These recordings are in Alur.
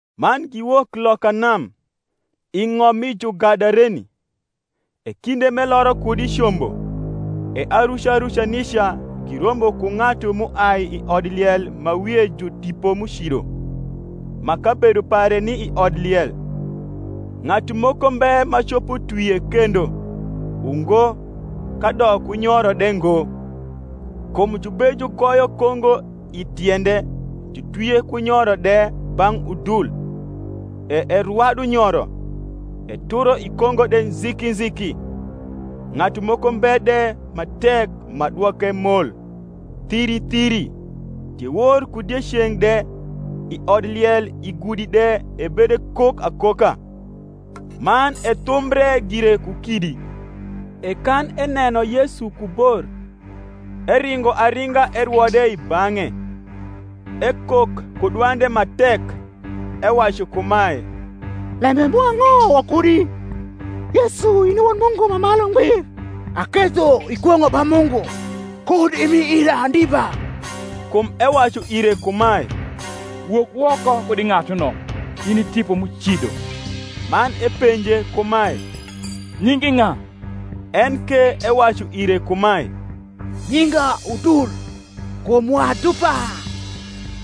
Man giwok loka nam, i ng’om mi Jugadareni. E kinde m’eloro kud i combo, e aruca ruca nica girombo ku ng’atu m’uai i odliel ma wie ju tipo m’ucido, ma kabedo pare ni i odliel: ng’atu moko mbe ma copo twie kendo, ungo, kadok ku nyoro de ngo; kum jubejugoyo kongo i tiende jutwie ku nyoro de bang’ udul, e erwadu nyoro, eturo i kongo de nziki nziki: ng’atu moko mbe de ma tek ma dwoke mol. Thiri thiri, diewor ku dieceng’ de, i odliel i gudi de ebedekok akoka, man ethumbre gire ku kidi. E kan eneno Yesu ku bor, eringo aringa erwo de i bang’e: ekok ku dwande ma tek, ewacu kumae, Lembe mwa ang’o wakudi, Yesu, in i Wod Mungu ma Malu Ngbir. Aketho ikwong’o ba Mungu, kud imi ira ndiba. Kum ewacu ire kumae, Wok woko kud i ng’atuno, in i tipo m’ucido. Man epenje kumae, Nyingi ng’a? En ke ewacu ire kumae, Nyinga Udul; kum wa dupa.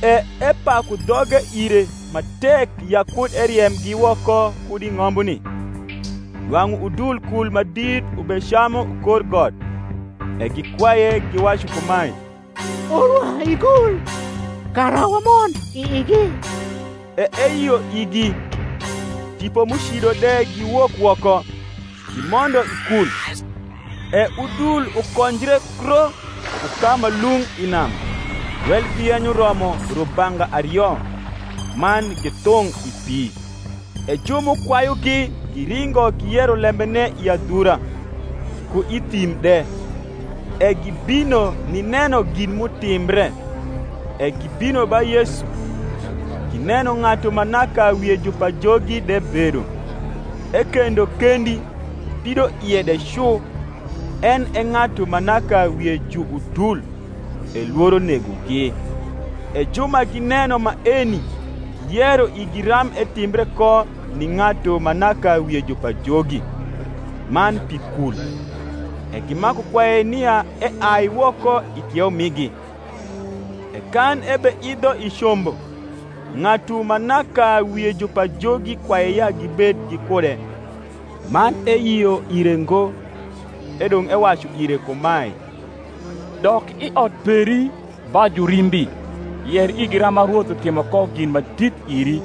E epaku dhoge ire ma tek ya kud eriemgi woko kud i ng’ombuni. Nwang’u udul kul ma dit ubecamu kor got. E gikwaye, giwacu kumae, Orwa i kul, kara wamond i igi. E eyio igi. Tipo m’ucido de giwok woko, gimondo i kul: e udul ukonjre kro ku ka ma lung’ i nam, welgi yenyo romo rubanga ario; man githung’ i pi. E ju m’ukwayugi giringo giyero lembene i adhura, ku i thim de. E gibino nineno gin m’utimbre. E gibino ba Yesu, gineno ng’atu ma naka wie ju pajogi de bedo, ekendo kendi pidoie de cu, en e ng’atu ma naka wie ju udul: e lworo negogi. E ju ma gineno maeni giyero igi ram etimbre ko ni ng’atu ma naka wie ju pajogi, man pi kul. E gimaku kwaye nia eai woko i kieu migi. E kan ebeidho i combo, ng’atu ma naka wie ju pajogi kwaye ya gibed gikude. Man eyio ire ngo, edong’ ewacu ire kumae, Dok i ot peri ba jurimbi, yer igi rama Rwoth utimo ko gin ma dit iri,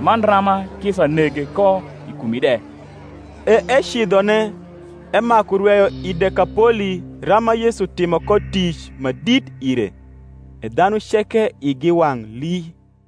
man rama kisa nege ko i kumi de. E ecidhone emaku rweyo i Dekapoli rama Yesu timo ko tic ma dit ire: e dhanu ceke igi wang’ lii.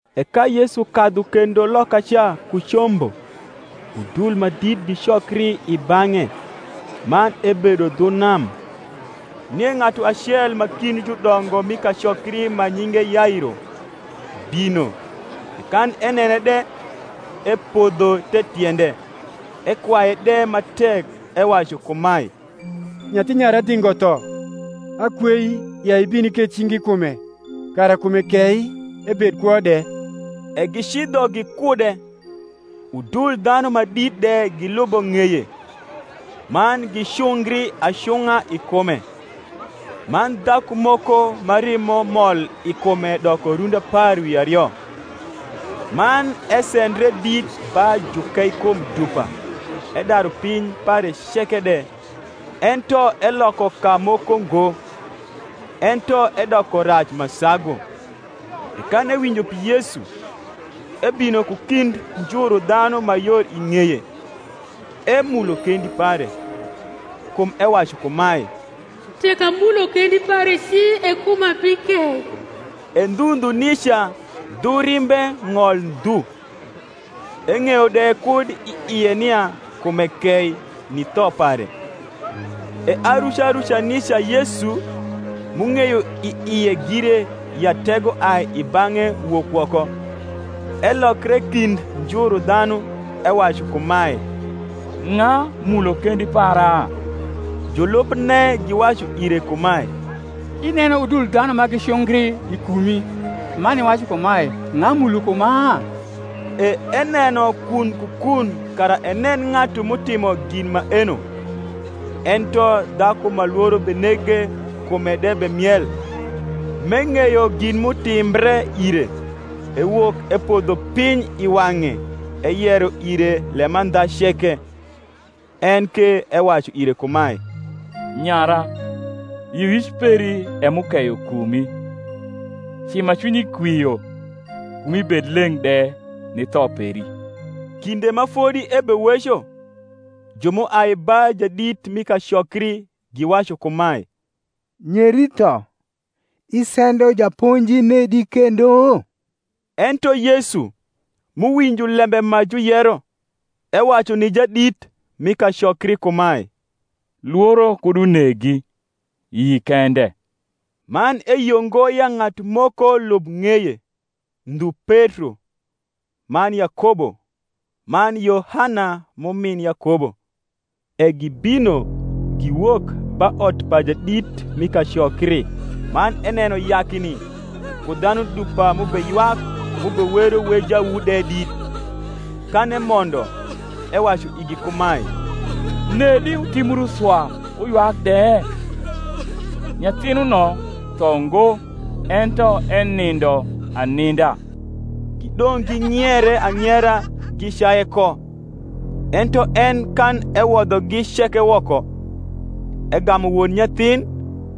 E ka Yesu kadhu kendo lokaca ku combo, udul ma dit gicokri i bang’e; man ebedo dhu nam. Nie ng’atu acel ma kind judongo m’i kacokri ma nyinge Yairo, bino; e kan enene de, epodho the tiende, ekwaye de ma tek, ewacu kumae, Nyathi nyara dhingo tho: akwei, ya ibin iketh cingi i kume, kara kume kei, ebed kwo de. E gicidho gikude; udul dhanu ma dit de gilubo ng’eye, man gicungri acung’a i kume. Man dhaku moko, ma rimo mol i kume doko rundi apar wi ario, man esendre dit ba jukeikum dupa edaru piny pare ceke de, ento eloko kamoko ngo, ento edoko rac ma sagu, e kan ewinjo pi Yesu, ebino ku kind njuru dhanu ma yor i ng’eye, emulo kendi pare. Kum ewacu kumae, Tek amulo kendi pare ci, e kuma bikei. E ndhu ndhu nica dhu rimbe ng’ol ndhu; eng’eyo de kud i ie nia kume kei ni tho pare. E aruca ruca nica Yesu, m’ung’eyo i ie gire ya tego ai i bang’e wok woko, elokre kind njuru dhanu, ewacu kumae, Ng’a mulo kendi para? Julubne giwacu ire kumae, Ineno udul dhanu ma gicungri i kumi, man iwacu kumae, Ng’a mulo kuma? E eneno kun ku kun kara enen ng’atu m’utimo gin maeno. Ento dhaku ma lworo benege kume de bemiel, m’eng’eyo gin m’utimbre ire, ewok epodho piny i wang’e eyero ire lemandha ceke. En ke ewacu ire kumae, Nyara, yioyic peri e m’ukeyo kumi; ci ma cwinyi kwio, kumi bed leng’ de ni tho peri. Kinde ma fodi ebeweco, ju m’uai ba jadit mi kacokri, giwacu kumae, Nyeri tho: isendo Japonji nedi kendo? Ento Yesu, m’uwinjo lembe ma juyero, ewacu ni jadit mi kacokri kumae, Lworo kud unegi, yi kende. Man eyio ngo ya ng’atu moko lub ng’eye, ndhu Petro, man Yakobo, man Yohana m’umin Yakobo. E gibino giwok ba ot pa jadit mi kacokri; man eneno yakni, ku dhanu dupa m’ubeywak m’ubewero wejawu de dit. Kan emondo, ewacu igi kumae, Nedi wutimbru swa wuywak de? nyathinuno tho ngo, ento enindo aninda. Gidong’ ging’iere ang’iera gicaye ko. Ento en kan ewodhogi ceke woko, egamu won nyathin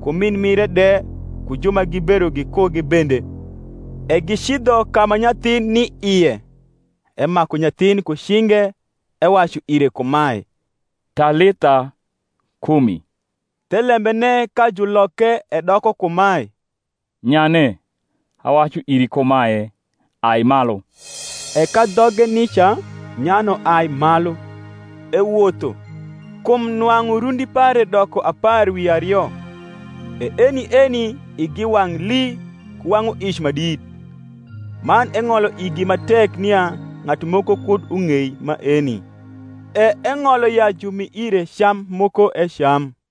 ku min mire de ku ju ma gibedo gikugi bende, e gicidho ka ma nyathin ni ie. Emaku nyathin ku cinge, ewacu ire kumae, Talitha kumi; thelembene, ka juloke edoko kumae, Nyane, awacu iri kumae, Ai malu. E ka dhoge nica nyano ai malu, ewotho; kum nwang’u rundi pare doko apar wi ario. E eni eni igi wang’ lii ku wang’uic ma dit. Man eng’olo igi ma tek nia ng’atu moko kud ung’ei maeni: e eng’olo ya jumi ire cam moko ecam.